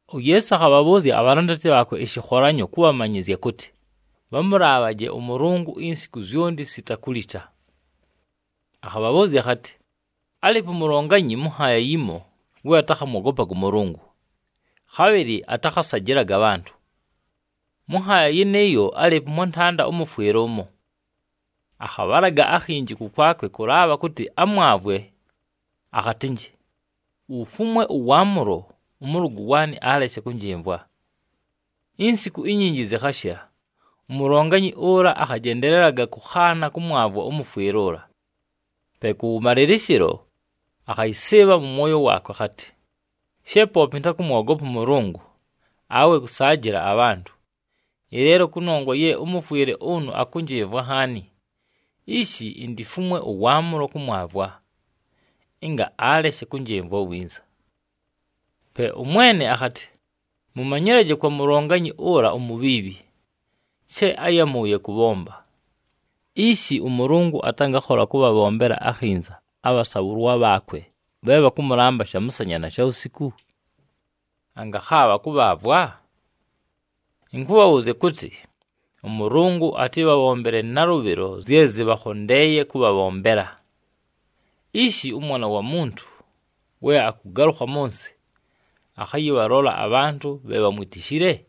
UYeesu akhabhabhʉʉzya abhalandati bhaakwe ɨshɨkholanyo kʉbhamanyɨzya kʉtɨ, bhamʉlaabhaje ʉMʉlʉngʉ insiku zyonti, sita kulita. Akhabhabhʉʉzya akhatɨ, “Álɨɨpo umulonganyi mʉ nhaaya yimo we atakhamwogopaga ʉMʉlʉngʉ, khabhɨlɨ atakhasajɨlaga abhantʉ. Mʉ nhaaya yɨnɨɨyo, álɨɨpo ʉmwantanda ʉmʉfwɨle ʉmo. Akhabhalaga akhinji kʉkwakwe kʉlaabha kʉtɨ amwavwe, akhatɨnjɨ, ‘Ufumwe ʉwaamʉlo, ʉmʉlʉgʉ waanɨ aleshe kʉnjɨmvwa.’ “Insiku inyinji zɨkhashɨla, umulonganyi ʉla akhajendelelaga kʉkhaana kʉmwavwa ʉmʉfwɨle ʉla. Pe kʉwʉmalɨlɨshɨlo, akhayɨsɨɨbha mʉ mwoyo waakwe akhatɨ, ‘She poope ɨntakʉmwogopa ʉMʉlʉngʉ, awe kʉsaajɨla abhantʉ, ɨleelo kʉnongwa ye ʉmʉfwɨle ʉnʉ akʉnjɨmvwa nhaani, ishi intifumwe ʉwaamʉlo kʉmwavwa, ɨnga aleshe kʉnjɨmvwa winza!’” Pe ʉMwene akhatɨ, “Mʉmanyɨlaje kwa mulonganyi ʉla umubhiibhi, she áyamʉʉye kʉbhomba! Ishi, ʉMʉlʉngʉ atangakhola kʉbhabhombela akhinza abhasaabhʉlwa bhaakwe bhe bhakʉmʉlamba shamʉsanya na shawusiku? Angakhaabha kʉbhaavwa? Ɨnkʉbhabhʉʉzya kʉtɨ, ʉMʉlʉngʉ atɨbhabhombele nalʉbhɨlo zye zɨbhakhondeeye kʉbhabhombela. Ishi ʉMwana wa Muntu we akʉgalʉkha mʉ nsɨ, akhayɨbhalola abhantʉ bhe bhamwitishile?”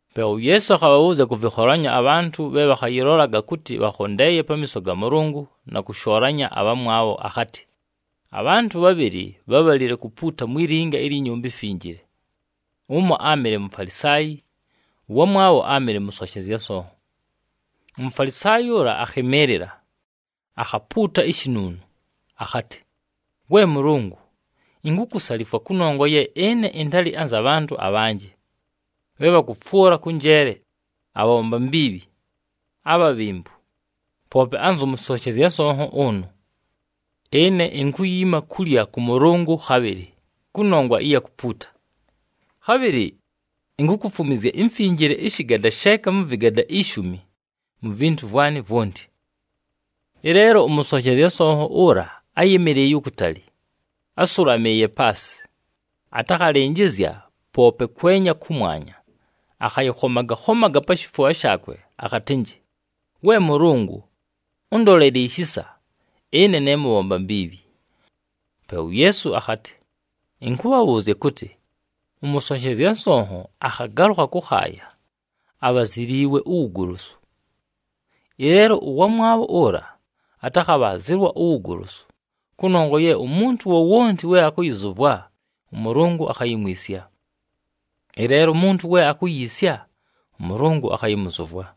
Pe uYeesu akhabhabhʉʉzya kʉ vɨkholanyo abhantʉ bhe bhakhayɨlolaga kʉtɨ bhakhondeeye pamiiso ga Mʉlʉngʉ na kʉshoolanya abhamwabho, akhatɨ, “Abhantʉ bhabhɨlɨ bhábhalile kupuuta mwi linga ilyi Nyumba iMfinjile, ʉmo áamɨle Mufalisaayi, ʉwamwabho áamɨle mʉsonshezya nsonho. “UMufalisaayi ʉla akhɨmɨɨlɨla, akhapuuta ishinuunu akhatɨ, ‘We Mʉlʉngʉ, inkukusalifwa, kʉnongwa ye ɨne ɨntalɨ anza bhantʉ abhanjɨ, bhe bhakʉfwʉla kʉ njeele, abhabhomba mbiibhi, abhabhembu, poope anzʉ mʉsonshezya nsonho ʉnʉ! Ɨne inkuyiima kulya kʉ mʉlʉngʉ khabhɨlɨ, kʉnongwa ɨya kupuuta. Khabhɨlɨ inkukufumwizya imfinjile ɨshɨgada sheeka mʉ vɨgada ishumi mu vintu vwanɨ vwonti.’ “Ɨleelo ʉmʉsonshezya nsonho ʉla áyɨmɨlɨɨye ukutali, ásʉlamɨɨye paasɨ, atakhalɨnjɨzya poope kwenya kʉmwanya, akhayɨkhomaga-khomaga pa shifubha shaakwe, akhatɨnjɨ, ‘We Mʉlʉngʉ, ʉndolele ishisa, ɨne ne mʉbhomba mbiibhi!’” Pe uYeesu akhatɨ, “Ɨnkʉbhabhʉʉzya kʉtɨ, ʉmʉsonshezya nsonho akhagalʉkha kʉkhaaya, abhaziliilwe uwugolosu. Ɨleelo ʉwamwabho ʉla, atakhabhaazɨlwa uwugolosu! Kʉnongwa ye umuntu wowonti we akʉyɨzʉvwa, ʉMʉlʉngʉ akhayimwisya. Ɨleelo umuntu we akuyiisya, ʉMʉlʉngʉ akhayɨmʉzʉvwa.”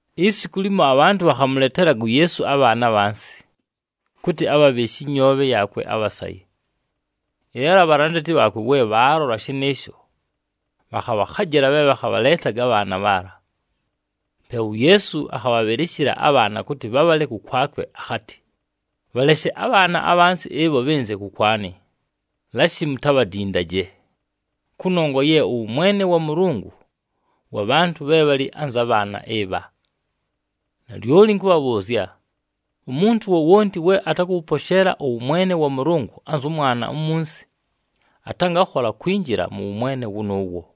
Isiku limo, abhantʉ bhakhamʉletelaga uYeesu abhaana abhansi, kʉtɨ abhabhɨɨshe ɨnyoobhe yaakwe abhasaye. Ɨleelo abhalandati bhaakwe we bhaalola shɨnɨɨsho, bhakhabhakhajɨla bhe bhakhabhaleetaga abhaana bhaala. Pe uYeesu akhabhabhɨlɨshɨla abhaana kʉtɨ bhabhale kʉkwakwe, akhatɨ, “Bhaleshe abhaana abhansi ɨbho bhɨnze kʉkwanɨ, lashi mutabhadindaje! Kʉnongwa ye ʉwʉmwene wa Mʉlʉngʉ wa bhantʉ bhe bhalɨ anza bhaana ɨbha. Nalyoli ɨnkʉbhabhʉʉzya, umuntu wowonti we atakʉwʉposheela ʉwʉmwene wa Mʉlʉngʉ anzʉ mwana umunsi, atangakhola kwinjila mʉ wʉmwene wʉnʉʉwo.”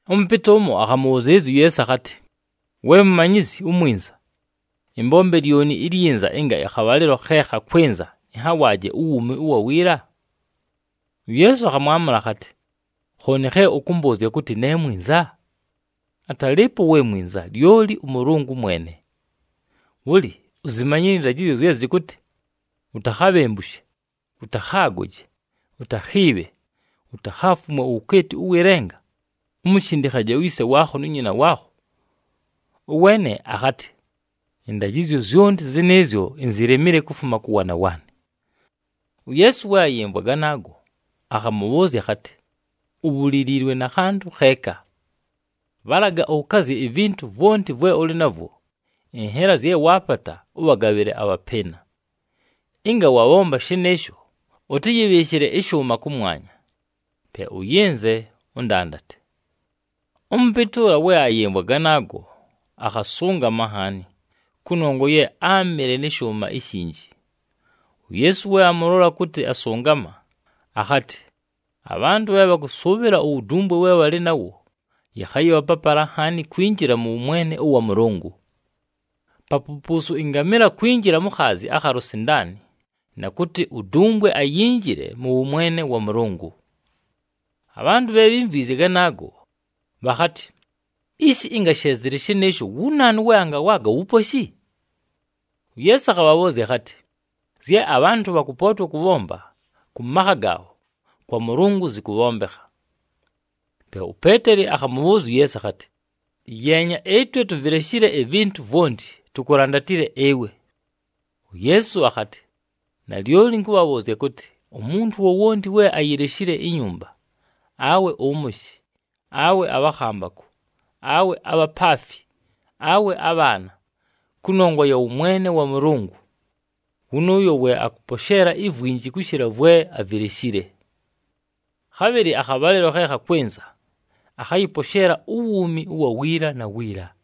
Ʉmʉpɨtɨ ʉmo akhamʉbhʉzɨɨlɨzya uYeesu akhatɨ, “We Mumanyizyi uMwinza, ɨmbombe lyoni ilyinza ɨnga akhabhalɨlo khe khakwɨnza ɨnhawaaje uwuumi ʉwa wiila?” UYeesu akhamwamʉla akhatɨ, “Khooni khe ʉkʉmbʉʉzya kʉtɨ ne mwinza? Atalɨɨpo we mwinza, lyoli ʉMʉlʉngʉ mwene! Bhʉlɨ, uzimanyile ɨndajɨzyo zye zɨkʉtɨ, ‘Utakhabhembushe, ʉtakhaagoje, utakhiibhe, utakhaafumwe uwukeeti ʉwɨ lenga, umushindikhaje uyise waakho nu nyina waakho.’” Ʉweene akhatɨ, “Ɨndajɨzyo zyonti zɨnɨɨzyo, inzilemile kufuma kʉ waana waanɨ.” UYeesu we ayɨmvwa ganaago, akhamʉbhʉʉzya akhatɨ, “Ubhuliliilwe na khantʉ kheeka. Bhalaga ʉkazye ivintu vwonti vwe ʉlɨ navwo, ɨnhela zye waapata, ʉbhagabhɨle abhapɨɨna. Ɨnga wabhomba shɨnɨɨsho, ʉtɨyɨbhɨɨshɨle ɨshʉʉma kʉmwanya. Pe ʉyɨnze, ʉndandate.” Ʉmʉpɨtɨ ʉla, we ayɨmvwa ganaago, akhasʉngama nhaani, kʉnongwa ye áamɨle nɨ shʉʉma ishinji. UYeesu we amʉlola kʉtɨ asʉngama, akhatɨ, “Abhantʉ bhe bhakʉsʉʉbhɨla uwudumbwe we bhalɨ nawo, yɨkhayɨbha papala nhaani kwinjila mʉ wʉmwene ʉwa Mʉlʉngʉ! Papupuusu ɨngamɨla kwinjila mu khaazi akha lusindaani, na kʉtɨ udumbwe ayinjile mʉ wʉmwene wa Mʉlʉngʉ!” Abhantʉ bhe bhímvwizye ganaago, bhakhatɨ, “Ishi, ɨnga she zɨlɨ shɨnɨɨsho, wu naanu we angawaaga uwuposhi?” UYeesu akhabhabhʉʉzya akhatɨ, “Zye abhantʉ bhakʉpootwa kʉbhomba kʉ makha gaabho, kwa Mʉlʉngʉ zɨkʉbhombekha.” Pe uPeeteli akhamʉbhʉʉzya uYeesu akhatɨ, “Yeenya, ɨtwe tuvileshile ivintu vwonti, tukulandatile ɨwe!” UYeesu akhatɨ, “Nalyoli ɨnkʉbhabhʉʉzya kʉtɨ, umuntu wowonti we ayileshile inyumba, awe ʉmʉshɨ, awe abhakhambakʉ, awe abhapaafi, awe abhaana, kʉnongwa ya wʉmwene wa Mʉlʉngʉ, wʉnʉʉyo we akʉposheela ivwinji kʉshɨla vwe avileshile. Khabhɨlɨ akhabhalɨlo khe khakwɨnza, akhayɨposheela uwuumi ʉwa wiila na wiila.”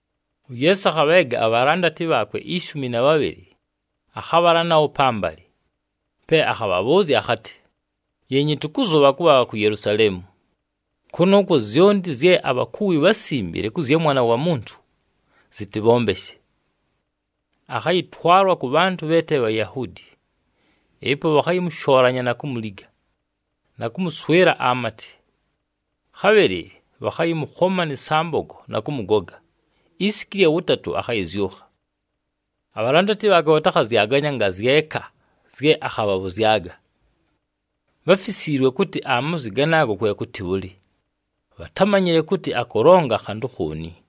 UYeesu akhabheega abhalandati bhaakwe ishumi na bhabhɨlɨ, akhabhala nabho pambalɨ, pe akhabhabhʉʉzya akhatɨ, “Yeenyi, tʉkʉzʉbha kʉbhala ku Yelusaleemu. Kʉnʉʉkwo, zyonti zye abhakuwi bhásimbile kʉ zya Mwana wa Muntu, zɨtɨbhombeshe. Akhayɨtwalwa kʉ bhantʉ bhe te Bhayahuudi. Ɨpo bhakhayɨmʉshoolanya na kumuliga, na kʉmʉswɨla amatɨ. Khabhɨlɨ bhakhayɨmʉkhoma nɨ sambogo na kʉmʉgoga, isiku ɨlya wʉtatʉ, akhayɨzyʉkha.” Abhalandati bhaakwe bhatakhazyaganya angazyeka zye akhabhabhʉzyaga. Bháfisiilwe kʉtɨ amazwi ganaaga kwe kʉtɨ bhʉlɨ, bhatámanyile kʉtɨ akʉlonga khantʉ khooni.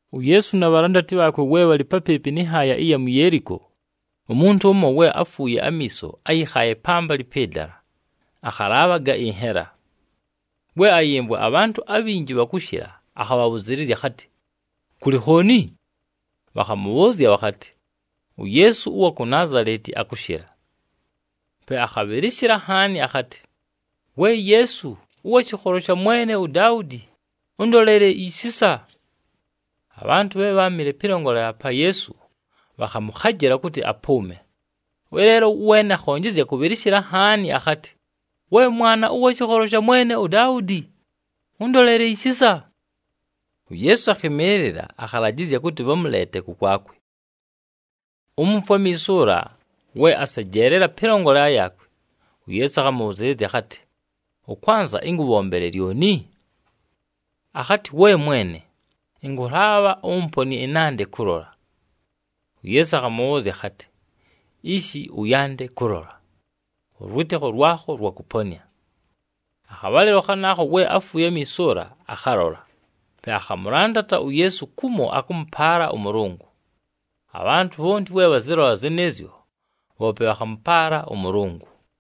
UYeesu na bhalandati bhaakwe we bhalɨ papɨɨpɨ nɨ nhaaya ɨya mu Yeeliko, umuntu ʉmo we áfuuye amiiso áyɨkhaaye pambalɨ pɨ dala, akhalaabhaga ɨnhela. We ayɨmvwa abhantʉ abhinji bhakʉshɨla, akhabhʉzɨɨlɨzya akhatɨ, “Kʉlɨ khooni?” Bhakhamʉbhʉʉzya bhakhatɨ, “UYeesu ʉwa ku Naazaleti akʉshɨla.” Pe akhabhɨlɨshɨla nhaani akhatɨ, “We Yeesu, ʉwa shɨkholo sha mwene uDaudi, ʉndolele ishisa!” Abhantʉ bhe bháamɨle pɨlongolela pa Yeesu, bhakhamʉkhajɨla kʉtɨ apʉʉme. Ɨleelo ʉweene akhonjezya kʉmʉbhɨlɨshɨla nhaani akhatɨ, “We Mwana ʉwa shɨkholo sha mwene uDaudi, ʉndolele ishisa!” UYeesu akhɨmɨɨlɨla, akhalajɨzya kʉtɨ bhamʉleete kʉkwakwe. Umufwe amiiso ʉla we asejeelela pɨlongolela yaakwe, uYeesu akhamʉbhʉzɨɨlɨzya akhatɨ, “Ʉkwanza ɨnkʉbhombele lyoni?” Akhatɨ, “We Mwene, ɨnkʉlaabha ʉmponɨe ɨnande kʉlola.” UYeesu akhamʉbhʉʉzya akhatɨ, “Ishi ʉyande kʉlola! Ʉlwɨtɨkho lwakho lwakʉponɨa.” Akhabhalɨlo khanaakho we áfuuye amiiso ʉla akhalola, pe akhamʉlandata uYeesu kumo akʉmʉpaala ʉMʉlʉngʉ. Abhantʉ bhonti we bhazɨlola zɨnɨɨzyo, bhoope bhakhamʉpaala ʉMʉlʉngʉ.